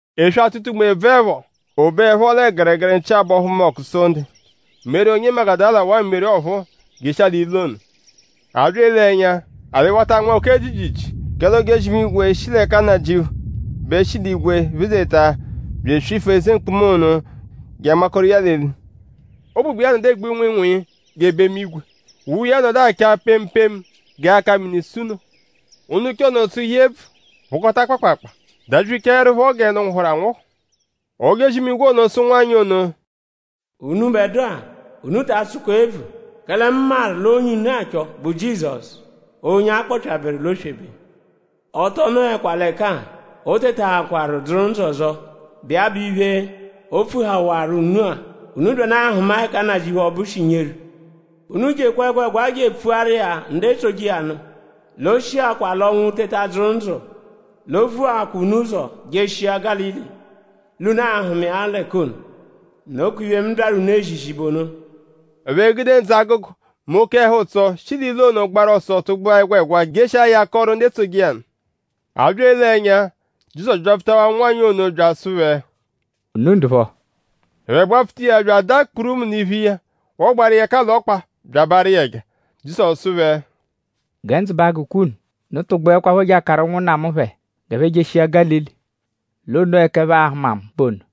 Eswe-atụta-unme -bvụepho; o beẹpho lẹ gẹregere nchi-abọhu mbọku Sonde; Meri; onye Magudala; waa Meri ọphuu; jeshia l'ilu ono. A bya ele ẹnya; alị wata anma oke jiijiijii; kẹle ojozi-imigwe, shi l'ẹka Nnajịuphu bẹ shi l'igwe phezeta bya eswifu eze mkpuma ono je anmakoru iya l'eli. Ụgbugba iya nọdu egbu nwịinwii g'ebemu-igwe. Uwe iya nọdu acha pemu pemu g'aka-mini-sunoo. Ndu nche ono tsụhu iya ebvu; phụkota kpaakpaakpaa; dabyichaẹrupho gẹ ndu nwụhuru anwụhu. Ojozi-imigwe ono sụ ụnwanyi ono: “Unubẹdua; unu ta atsụkwa ebvu; kẹle mu maru l'onye unu achọ bụ Jizọsu; onye a kpọpyaberu l'oswebe. Ọ tọ nọekwa l'ẹka-a. O tetaakwaru dzụru ndzụ ọzo, bụ iya bụ iphe, o pfuhawaru unu-a. Unu byanụ ahụma ẹka Nnajịuphu ọbu shi nyeru. Unu jekwa ẹgwegwa je epfuaru iya ndu etsoje iya nụ l'o shiakwa l'ọnwu teta dzụru ndzụ; l'o vuakwa unu ụzo jeshia Gálili; l'unu a-hụma iya l'ẹka ono. Nokwa iphe, mu byaru unu ezizi bụ ono.” Ẹphe gude ndzụ-agụgu mẹ oke ẹhu-ụtso shi l'ilu ono gbaru ọso tụgbua ẹgwegwa jeshia ya akọru ndu etsoje iya nụ. A bya ele ẹnya; Jizọsu byapfutawaa ụnwanyi ono bya asụ phẹ: “?Unu ndụpho?” Ẹphe gbapfuta iya; bya adaa kpurumu l'iphu iya; wọgbaaru iya ẹka l'ọkpa; bya abaarụ iya ẹja. Jizọsu sụ phẹ: “Gẹ ndzụ ba agụkwa unu. Unu tụgbuekwapho je akaru ụnwunna mu phẹ g'ẹphe jeshia Gálili; l'onoo ẹka ẹphe a-hụma mu bụ ono.”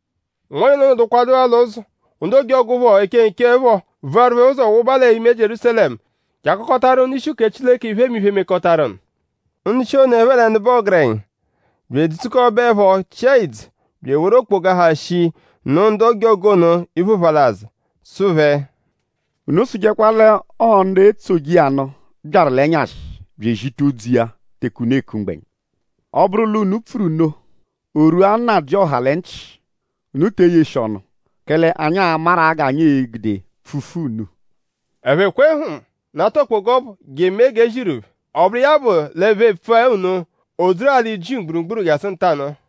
Ụnwanyi ono nọdukwadu l'ụzo; ndu ojọgu phọ, eche nche phọ vuwaru phẹ ụzo wụba l'ime Jierúsalẹmu je akọkotaru ndu-ishi uke Chileke iphemiphe, mekọtaru nụ. Ndu-ishi ono ẹphe lẹ ndu bụ ọgerenya bya edzukọbeepho chịa ìdzù bya eworu okpoga, ha shii nụ ndu ojọgu ono iphe ụphalazu; sụ phẹ: “Unu sụjekwa l'ọo ndu etsoje iya nụ byaru l'ẹnyashi bya ezita odzu iya teke unu eku mgbẹnya.” “Ọ -bụru l'unu pfuru nno; o -rwua nnajịoha lẹ nchị; unu te eyeshi ọnu; kẹle anyi a-maru-a g'anyi e-gude pfufu unu.” Ẹphe kwe hm; nata okpoga ọbu je emee g'e ziru phẹ. Ọ bụru iya bụ l'ẹphe epfua nno; o dzuru alị Jiu mgburugburu jasụ ntanụ-a.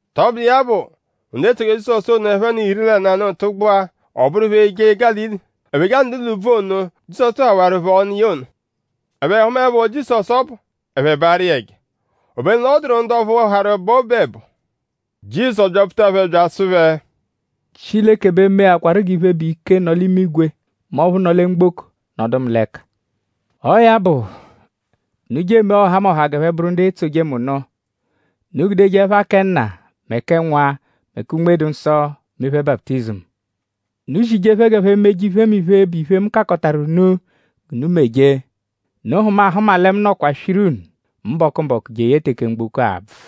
Tọbudu iya bụ; ndu etsoje Jizọsu ono ẹphe n'iri lẹ nanụ tụgbua; ọ bụru phẹ eje Gálili. Ẹphe je anọdu l'úbvú ono, Jizọsu tụhawaru phẹ ọnu iya ono. Ẹphe hụmaepho Jizọsu ọbu; ẹphe baarụ iya ẹja. Obenu l'ọ dụru ndu ọphu harụ bọo obu ẹbo. Jizọsu byapfuta phẹ bya asụ phẹ: “Chileke bẹ meakwaru g'iphe, bụ ike, nọ l'imigwe mẹ ọphu nọ lẹ mgboko nọdu mu l'ẹka. Ọo ya bụ; unu je emee ọhamoha g'ẹphe bụru ndu etsoje mu nụ. Unu gudeje ẹpha kẹ Nna; mẹ kẹ Nwa; mẹ kẹ Unme-dụ-Nsọ mee phẹ baputizimu. Unu zije phẹ g'ẹphe meje iphemiphe, bụ iphe, mu kakọtaru unu g'unu meje. Unu hụma ahụma lẹ mu nọkwa swiru unu mbọku-mbọku jeye teke mgboko a-bvụ.”